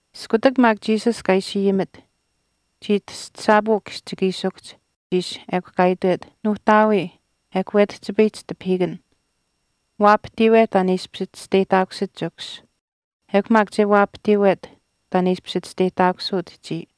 Iskutak maak Jesus kaa chiishi ayimit, chii tastasaapuu kihchikiishikuhch ishi ekw kaa itwet, “Nuuhtaawii, ekw wetihchipayihch tipahiikan. Waapahtiiwe taan e ishpish chisteyihtaakusit Chikus ekw maak che waapahtiiwet taan e ishpish chisteyihtaakusuut chiya.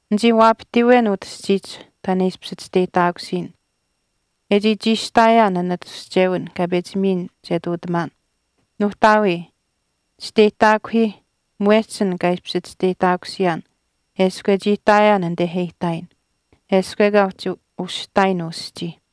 Nichii waapahtiiwen utah aschiihch taan e ishpish chisteyihtaakusiyin, e chii chiishihtaayaan an atushchewin kaa pechi miyin che ihtuutamaan. Nuuhtaawii, chisteyihtaakuhiih mwehch an kaa ishpish chisteyihtaakusiyaan eshkw e chii ihtaayaan anite e ihtaayin, eshkw ekaa uhchi ushihtaayin uu aschii.”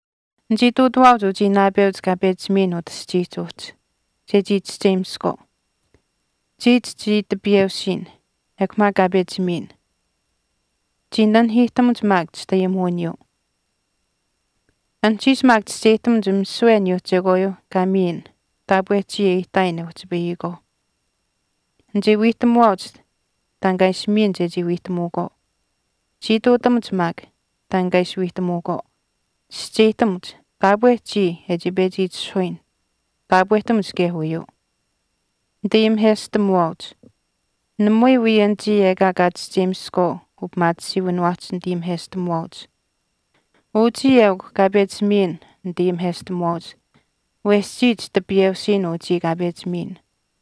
“Nichii ihtuutawaauch uchii naapeuch kaa pechi miyin utah aschiihch uhchi chechii chischeyimiskwaau. Chiya chichii tipiyeusiin ekw maak kaa pechi miyin. Chii nanihiihtamuch maak chitayimuwiniyuu. Anuhchiish maak chischeyihtamuch misiwe aniyuuh chekwaayuu kaa miyin taapwe chiya e ihtaayin e uhchipayihkwaauh. Nichii wiihtamuwaauch taan kaa ishi miyin chechii wiihtamuukwaau. Chii utinamuch maak taan kaa ishi wiihtamuukwaau. Chischeyihtamuch taapwe chiya e chii pechi itishahuyin taapwehtamuch kaye uyuu.” “Nitayimiheshtamuwaauch, namui wii anichii ekaa kaa chischeyimiskwaau upimaatisiiwiniwaahch nitayimiheshtamuwaauch. Uchii eukw kaa pechi miyin nitayimiheshtamuwaauch wesh chiya chitipiyeusiin uchii kaa pechi miyin.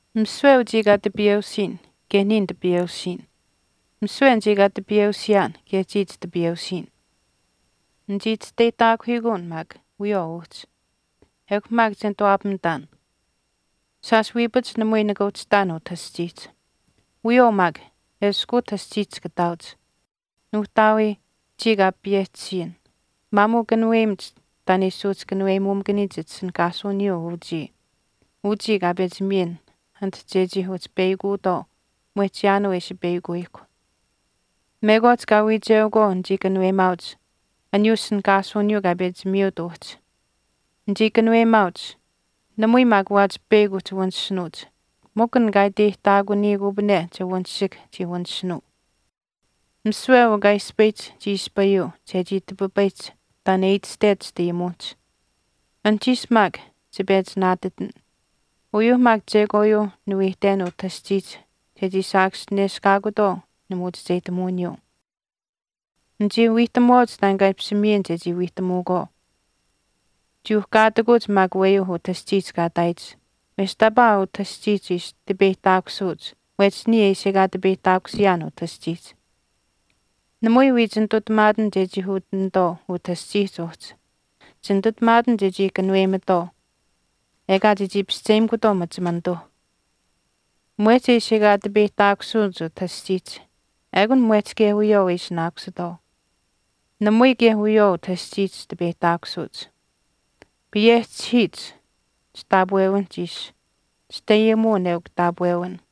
Misiwe uchii kaa tipiyeusiyin kaye niya nitipiyeusiin. Misiwe anichii kaa tipiyeusiyaan kaye chiya chitipiyeusiin. Nichii chisteyihtaakuhiikuun maak wiyawaau uhchi. Ekw maak che nituwaapamitaan. Shaash wiipach namui nika uhchi ihtaan utah aschiihch. Wiyawaau maak eshkw utah aschiihch chika ihtaauch. Nuuhtaawii, chiya kaa payehchisiyin, maamuu kanuweyimach taan e ishi suuhchikanuweyimuumakaniyich chitishinihkaasuwiniyuu uchii kaa pechi miyin anit chechii uhchi peyakutwaau mwehch chiyaanuu e ishi peyakuyihkw. Mekwaach kaa wiicheukwaau nichii kanuweyimaauch aniyuu ishinihkaasuwiniyuu kaa pechi miyuut uhchi. Nichii kanuweyimaauch, namui maak waachi peyakw uhchi wanishinuuch mikw an kaa iteyihtaakuniyikupane che wanishihk chii wanishinuu. Misiwe uu kaa ispayihch chii ispayuu chechii tipipayihch taan e itashtech chitayimuwinihch. Anuhchiish maak chipechi naatitin, uyuuh maak chekwaayuuh niwiihten utah aschiihch chechii saakaschineshkaakutwaau nimuuchicheyihtamuwiniyuu. Nichii wiihtamuwaauch taan kaa ishi miyin chechii wiihtamuukwaau. Chii uhkaatikuch maak aweyuu utah aschiihch kaa ihtaayich wesh taapaa utah aschiihch ishi tipeyihtaakusuuch mwehch niya e ishi ekaa tipeyihtaakusiyaan utah aschiihch. Namui wii chinitutamaatin chechii utinatwaau utah aschihch uhchi, chinitutamaatin chechii kanuweyimatwaau ekaa chechii pischeyimikutwaau machimanituuh. Mwehch e ishi ekaa tipeyihtaakusuuch utah aschiihch ekun mwehch kaye wiyawaau e ishinaakusitwaau. Namui kaye wiyawaau utah aschiihch tipeyihtaakusuuch. Payehchihiich chitaapwewinihch ishi. Chitayimuwin eukw taapwewin.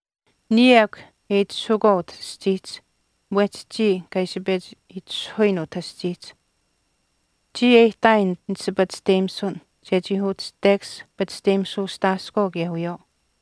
Niya ekw e itishahukwaau utah aschiihch mwehch chii kaa ishi pechi itishahuyin utah aschiihch. Chiya e ihtaayin nit ishi pachishteyimisun chechii uhchi tekash pachishteyimisuustaaskwaau kaye wiyawaau.”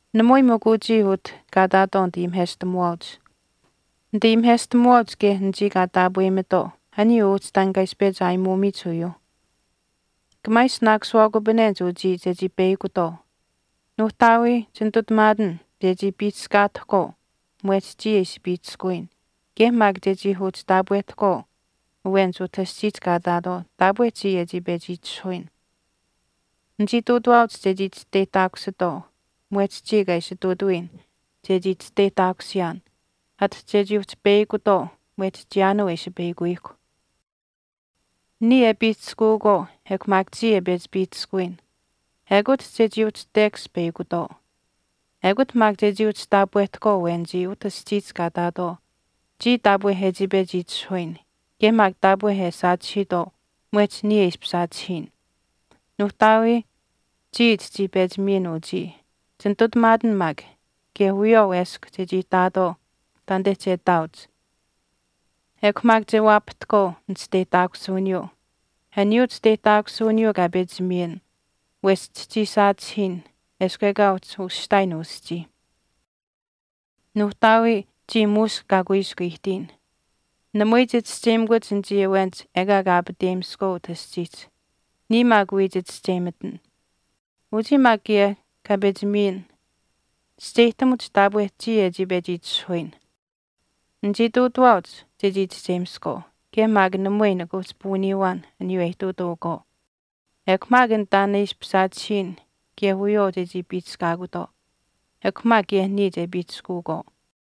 “Namui mikw uchii utah kaa ihtaatwaau nitayimiheshtamuwaauch. Nitayimiheshtamuwaauch kaye anichii kaa taapweyimatwaau aniyuu uhchi taan kaa ishi pechi aayimuumiyich uyuuh. Kamaa ishinaakusiwaakupanenich uchii chechii peyakutwaau. Nuuhtaawii, chinitutamaatin chechii piihchishkaatahkwaau mwehch chiya e ishi piihchishkuwiyin kaye maak chechii uhchi taapwehtahkwaau awenich utah aschiihch kaa ihtaatwaau taapwe chiya e chii pechi itishahuyin. Nichii ihtuutawaauch chechii chisteyihtaakusitwaau mwehch chiya kaa ishi ihtuutawiyin chechii chisteyihtaakusiyaan ati chechii uhchi peyakutwaau mwehch chiyaanuu e ishi peyakuyihkw. Niya e piihchishkuukwaau ekw maak chiya e pechi piihchishkuwiyin ekut chechii uhchi tekash peyakutwaau. Ekut maak chechii uhchi taapwehtahkwaau awenichii utah aschiihch kaa ihtaatwaau chiya taapwe e chii pechi itishahuyin kaye maak taapwe e saachihiitwaau mwehch niya e ishpish saachihiyin.” “Nuuhtaawii, chiya chichii pechi miyin uchii, chinitutamaatin maak kaye wiyawaau eshkw chechii ihtaatwaau taanite che ihtaauch. Ekw maak che waapahtahkwaau nichisteyihtaakusuwiniyuu, aniyuu chisteyihtaakusuwiniyuu kaa pechi miyin wesh chichii saachihiin eshkw ekaa uhchi ushihtaayin uu aschii. Nuuhtaawii, chiya muush kaa kuiskw ihtiyin, namui chichischeyimakuch anichii awenich ekaa kaa aapateyimiskwaau utah aschiihch, niya maak wii chichischeyimitin. Uchii maak kaye kaa pechi miyin chischeyihtamuch taapwe chiya e chii pechi itishahuyin. Nichii ihtuutawaauch chechii chischeyimiskwaau kaye maak namui nika uhchi puuniiwaan aniyuu e ihtuutuukwaau. Ekw maak an taan e ishpish saachihiyin kaye wiyawaau chechii piihchishkaakutwaau. Ekw maak kaye niya che piihchishkuukwaau.”